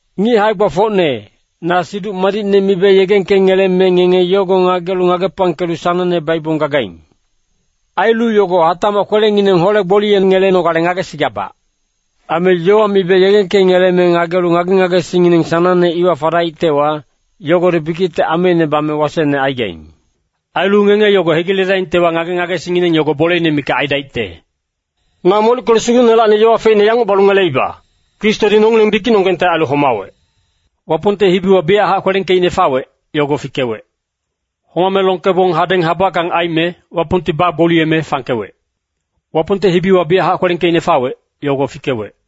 Ngic hae-gbafocne, na Siduc Madicne mibe yegengkengeleme ngenge yogo ngagelu ngagepangkelu sanangne baibong gagaing. Ailu yogo hatacmac kwelengineng hole-gboliyengelenogale ngagesigabac. Aime yowa mibe yegengkengeleme ngagelu ngage-ngagesingngineng sanangne iwa fadaictewa, yogodi bikicte ameine bame wasecne aigaing. Ailu ngenge yogo hegiledaingtewa, ngage-ngagesingngineng yogo boleine mikac aidaicte. Na molickelu Sugucnelacni yowa feicne yanguc balu ngeleiba, Kristodi nongileng bikicnonggengte ailu homawec. Wapongte hibiwa biyachac kwelengkeicne fawec, yogo fikewec. Homame longkebong hadeng habackang aime, Wapongti bagboliyeme fangkewec. Wapongte hibiwa biyachac kwelengkeicne fawec, yogo fikewec.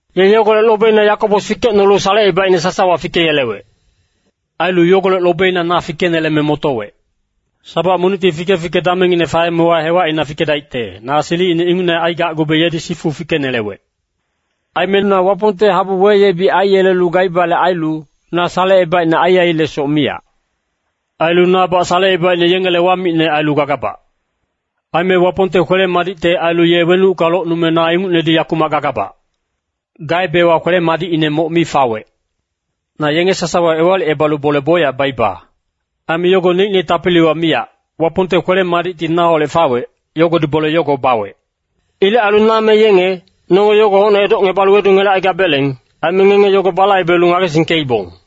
Ye yogolec lobeina Yakobos fikecnolu salecebaicne sasawa fikeyelewec. Ailu yogolec lobeina na fikeneleme motowec. Sabac monicti fike-fike damengine faemewa hewacina fikedaicte, na silicine ingucne aigacgube yedi sifu fikenelewec. Aime na Wapongte habu weyebic aiyelelu gaibale ailu, na salecebaicne aiailesoc miyac. Ailu nabac salecebaicne yengele wamicne ailu gagabac. Aime Wapongte kwele-madicte ailu ye wenucka locnume na ingucnedi yakumac gagabac. Gaebewa kwele-madicine moc mi fawec. Na yenge sasawa ewalicebalu bole bocyac baiba. Aime yogo neicne tapiliwa miyac, Wapongte kwele-madicti naholec fawec, yogodi bole yogo bawec. Ilec ailu na me yenge, nonge yogo hocne edocngebalu wedungelecaigabeleng. Aime ngenge yogo balaibelu ngagesingkeibong.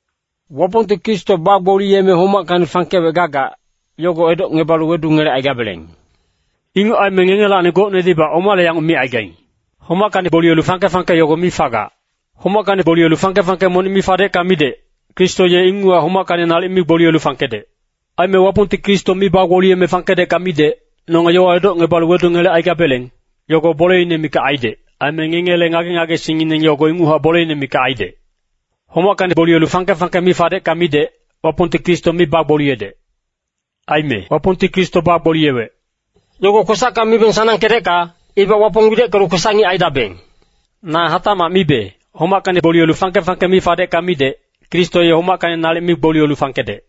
Wapongti Kristo bagboliyeme homackacni fangkewec gagac, yogo edocngebalu wedungelecaigabeleng. Inguc aime ngengelacni gocnedibac omale yanguc micaigaing, “Homackacni gboliyelu fangke-fangke yogo mi fagac.” Homackacni gboliyelu fangke-fangke monic mi fadecka midec, Kristo ye inguchac homackacni nalic mi gboliyelu fangkedec. Aime Wapongti Kristo mi bagboliyeme fangkedecka midec, nonge yowa edocngebalu wedungelecaigabeleng, yogo boleine mikac aidec. Aime ngengele ngage-ngagesingngineng yogo inguchac boleine mikac aidec. Homackacni gboliyelu fangke-fangke mi fadecka midec, Wapongti Kristo mi bagboliyedec. Aime “Wapongti Kristo bagboliyewec,” yogo kwesacka mibeng sanangkedecka, ibac Wapong wideckelu kwesac-ngic aidabeng. Na hatacmac mibe, homackacni gboliyelu fangke-fangke mi fadecka midec, Kristo ye homackacni nalic mi gboliyelu fangkedec.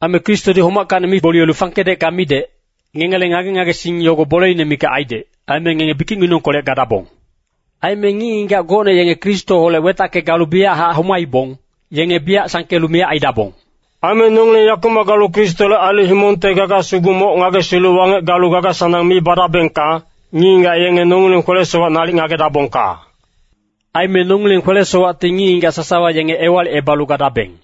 Aime Kristodi homackacni mi gboliyelu fangkedecka midec, ngengele ngage-ngagesing yogo boleine mikac aidec, aime ngenge bikicnginengkolec gadabong. Aime ngic-ngigac gocne yenge Kristoholec wetacke galu biyachac homaibong, yenge biyac sangkelu miyac aidabong. Aime nongileng yakumac galu Kristole ailu himongte gaga sugu moc ngagesilu wangec galu gaga-sanang mi badabengka, ngic-ngigac yenge nongileng kwele-sowac nalic ngagedabongka. Aime nongileng kwele-sowacti ngic-ngigac sasawa yenge ewalicebalu gadabeng.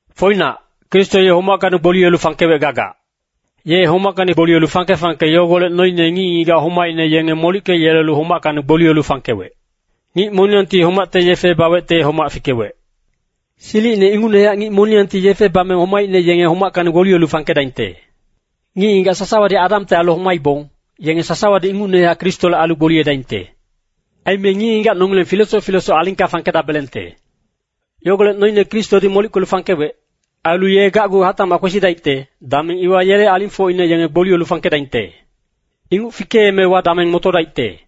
Foinac, Kristo ye homackacni gboliyelu fangkewec gagac. Ye homackacni gboliyelu fangke-fangke yogolec noine ngic-ngigac homaicne yenge molickeyelelu homackacni gboliyelu fangkewec. Ngic moniyangti homacte yefe bawecte homac fikewec. Silicine ingucnehac ngic moniyangti yefe bame homaicne yenge homackacni gboliyelu fangkedaingte. Ngic-ngigac sasawadi Adamte ailu homaibong, yenge sasawadi ingucnehac Kristole ailu gboliyedaingte. Aime ngic-ngigac nongileng filesoc filesoc alingka fangkedabelengte. Yogolec noine Kristodi molickelu fangkewec. Ailu ye gacgu hatacmac kwesidaicte, dameng iwa yele alingfocine yenge gboliyelu fangkedaingte. Inguc fikeemewa dameng motodaicte.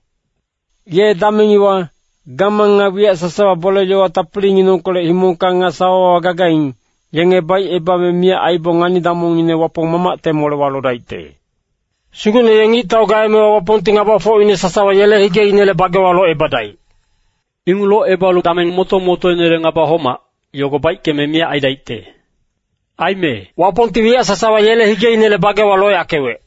Ye dameng iwa, gamang nga wiyac sasawa bole-yowa tapilinginengkolec himongka nga sawawa gagaing, yenge baicebame miyac aibong, ngani-damongngine Wapong Mamacte molewa lodaicte. Sugucne ye ngictau gaemewa Wapongti ngabafocine sasawa yele higeinele bagewa locebadaic. Inguc locebalu dameng moto-motoinele ngaba homac, yogo baickeme miyac aidaicte. Aime “Wapongti wiyac sasawa yele higeinele bagewa loyackewec.”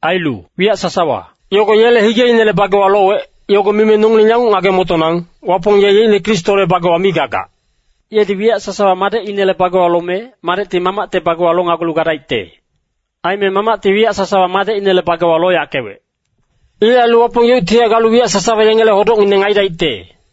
Ailu “wiyac sasawa” yogo yele higeinele bagewa lowec, yogo mime nongileng yanguc ngage-motonang, Wapong ye yeicne Kristole bagewa mi gagac. Yedi wiyac sasawa Madecinele bagewa lome, Madecti Mamacte bagewa lonagulu gadaicte. Aime Mamacti wiyac sasawa Madecinele bagewa loyackewec. Ilec ailu Wapong yeuctihac galu wiyac sasawa yengele hodocngineng aidaicte.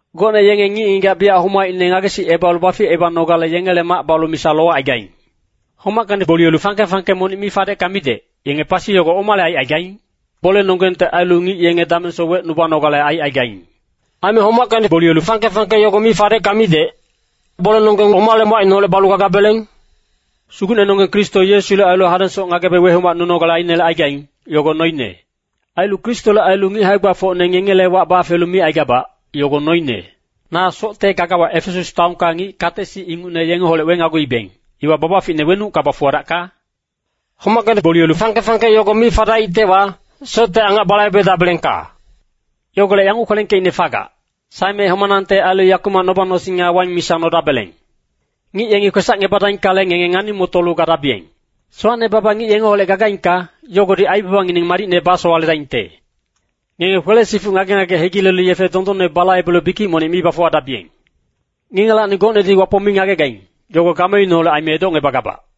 Gocne yenge ngic-ngigac biyac homaicne ngagesicebalu baficebanogale yengele mac balu misa lowacaigaing. Homackacni gboliyelu fangke-fangke monic mi fadecka midec, yenge pasi yogo omale aicaigaing? Bolenonggengte ailu ngic yenge damengsoc wecnubanogale aicaigaing. Aime homackacni gboliyelu fangke-fangke yogo mi fadecka midec, bolenonggeng omale umacineholec balu gagabeleng? Sugucnenonggeng Kristo Yesule ailu hadengsoc ngagebe wehomacnunogale ainelecaigaing, yogo noine. Ailu Kristole ailu ngic hae-gbafocne ngengele wac bafelu micaigabac, yogo noine. Na socte gagawa Efesas taonka ngic kate-sic ingucne yengeholec wenaguibeng, iwa babaficine wenucka bafuwadacka? Homackacni gboliyelu fangke-fangke yogo mi fadaictewa, socte angac balaibedabelengka. Yogolec yanguc kwelengkeicne fagac, “Saeme homanangte ailu yakumac noba-nosing nga waing misa nodabeleng.” Ngic yengi kwesacngebadaingkale, ngenge ngani-motolu gadabiyeng. Sowacne baba ngic ngengeholec gagaingka, yogodi aibabangineng madicne basowaledaingte. Ngenge kwele-sifuc ngage-ngage hegilelu yefe dondonne balaibelu bikic monic mi bafuwadabiyeng. Ngengelacni gocnedi Wapong mi ngagegaing, yogo gameineholec aime edocngebagabac.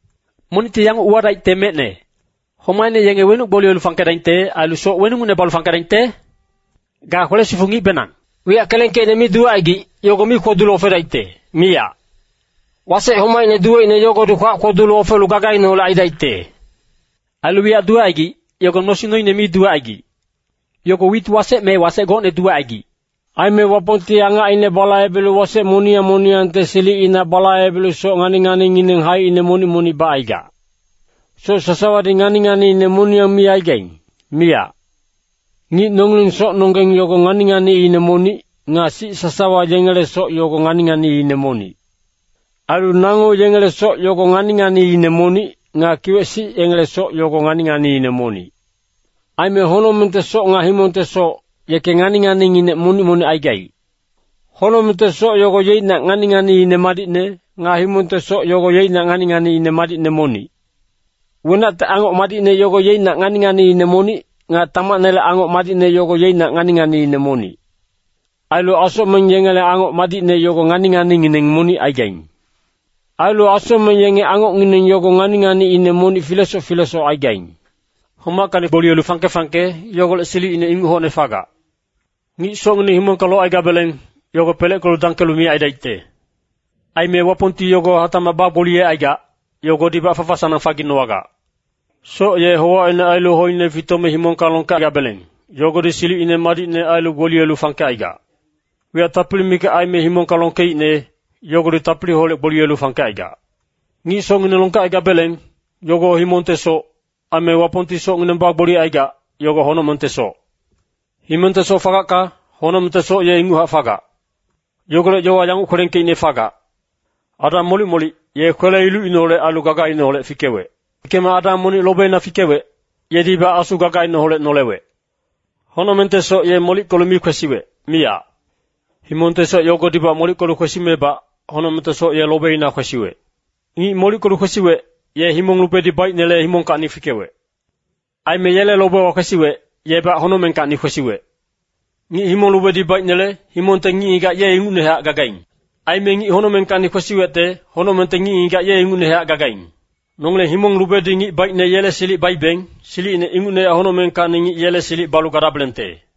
Monicti yanguc uwadaicte mecne, “Homaicne yenge wenuc gboliyelu fangkedaingte? Ailu soc weningucne balu fangkedaingte?” Ga kwele-sifuc ngicbenang. Wiyac kelengkeicne mi duwecaigic, yogo mi kwodulu ofedaicte, miyac. Wasec homacine duweicne yogodi kwacine kwodulu ofelu gagaineholec aidaicte. Ailu wiyac duwecaigic, yogo nosing noine mi duwecaigic. Yogo wit wasec me wasec gocne duwecaigic. Aime Wapongti angacine balaibelu wasec moniyang moniyangte silicina balaibelu soc ngani-nganingineng haicine monic-monic bacaigac. Soc sasawadi ngani-nganiine moniyang mi aigaing, miyac. Ngic nongileng socnonggeng yogo ngani-nganiine monic, nga sic sasawa yengele soc yogo ngani-nganiine monic. Ailu nango yengele soc yogo ngani-nganiine monic, nga kiwec-sic yengele soc yogo ngani-nganiine monic. Aime honocmengte soc nga himongte soc, yeke ngani-nganinginec monic-monic aigaic. Honocmengte soc yogo yeicnac ngani-nganiine madicne, nga himongte soc yogo yeicnac ngani-nganiine madicne monic. Wenacte angoc madicne yogo yeicnac ngani-nganiine monic, nga tamacnele angoc madicne yogo yeicnac ngani-nganiine monic. Ailu asocmeng yengele angoc madicne yogo ngani-nganingineng monic aigaing. Ailu asocmeng yenge angocngineng yogo ngani-nganiine monic filesoc filesoc aigaing. Homackacni gboliyelu fangke-fangke, yogolec silicine inguc hocne fagac. Ngic socngineng himongka locaigabeleng, yogo peleckelu dangkelu miyac aidaicte. Aime Wapongti yogo hatacmac bagboliyecaigac, yogodibac fafa-sanang faginowagac. Soc ye howacine ailu hoine fitome himongka longkegabeleng, yogodi silicine madicne ailu gboliyelu fangkecaigac. Wiyac tapili mikac aime himongka longkeicne, yogodi tapiliholec gboliyelu fangkecaigac. Ngic socngineng longkecaigabeleng, yogo himongte soc. Aime Wapongti socngineng bagboliyecaigac, yogo honocmengte soc. Himongte soc fagacka, honocmengte soc ye inguchac fagac. Yogolec yowa yanguc kwelengkeicne fagac, “Adam molic-molic, ye kwele-ilucineholec ailu gagaineholec fikewec.” Fikeme Adam monic lobeina fikewec, yedibac asu gagaineholec nolewec. Honocmengte soc ye molickelu mi kwesiwec, miyac. Himongte soc yogodibac molickelu kwesimebac, honocmengte soc ye lobeina kwesiwec. Ngic molickelu kwesiwec, ye himong lubedi baicnele himongkacni fikewec. Aime yele lobewa kwesiwec, yebac honocmengkacni kwesiwec. Ngic himong lubedi baicnele, himongte ngic-ngigac ye ingucnehac gagaing. Aime ngic honocmengkacni kwesiwecte, honocmengte ngic-ngigac ye ingucnehac gagaing. Nongileng himong lubedi ngic baicne yele silic baibeng, silicine ingucnehac honocmengkacni ngic yele silic balu gadabelengte.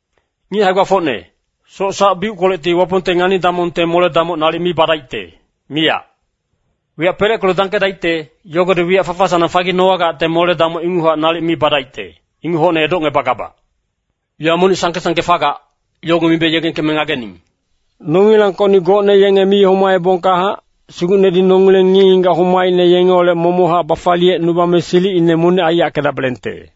Ngic hae-gbafocne, soc sac-biuckolecti Wapongte ngani-damongte mole-damoc nalic mi badaicte, miyac. Wiyac peleckelu dangkedaicte, yogodi wiyac fafa-sanang faginowagacte mole-damoc inguchac nalic mi badaicte, inguc hocne edocngebagabac. Yowa monic sangke-sangke fagac, yogo mibe yegengkeme ngagening. Nongilangkocni gocne yenge mi homaebongkahac, Sugucnedi nongileng ngic-ngigac homaicne yengeholec momochac bafaliyecnubame silicine monic aiyackedabelengte.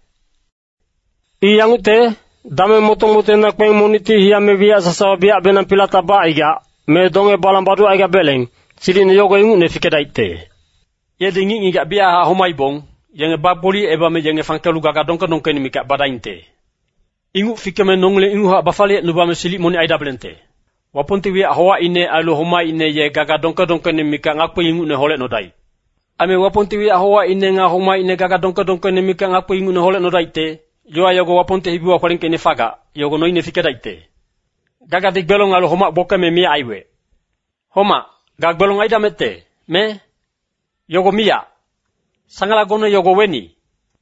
I yangucte, dameng moto-motoina kpeng monicti hiyame wiyac sasawa biyacbenang pilatac bacaigac, me donge-balang baducaigabeleng, silicine yogo ingucne fikedaicte. Yedi ngic-ngigac biyachac homaibong, yenge bagboliyecebame yenge fangkelu gaga dongke-dongkeine mikac badaingte. Inguc fikeme nongileng inguchac bafaliyecnubame silic monic aidabelengte. Wapongti wiyac howacine ailu homaicne ye gaga dongke-dongkeine mikac ngakpi ingucne holecnodaic. Aime Wapongti wiyac howacine nga homaicne gaga dongke-dongkeine mikac ngakpi ingucne holecnodaicte. Yowa yago Wapongte hibiwa kwelengkeicne fagac, yogo noine fikedaicte, “Gagadi gbelong ailu homac gbokeme miyac aiwec.” “Homac, ga gbelong aidamecte, me? Yogo miyac! Sangalagone yogo weni?”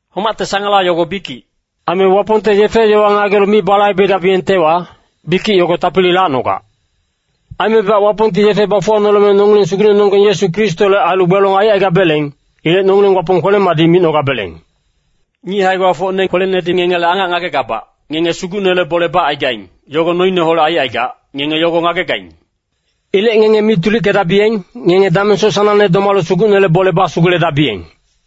Homacte sangala yogo bikic. Aime Wapongte yefe-yowa ngagelu mi balaibegabiyengtewa, bikic yogo tapili lacnogac. Aimebac Wapongti yefe bafuwanoleme nongileng Sugucnenonggeng Yesu Kristole ailu gbelong aicaigabeleng. Ilec nongileng Wapong kwele-madic micnogabeleng. Ngic hae-gbafocne kwelenedi ngengele angac ngagegabac, ngenge Sugucnele bole bacaigaing, yogo noineholec aicaigac, ngenge yogo ngagegaing. Ilec ngenge mi tulickedabiyeng, ngenge damengsoc sanangne domalu Sugucnele bole basuguledabiyeng.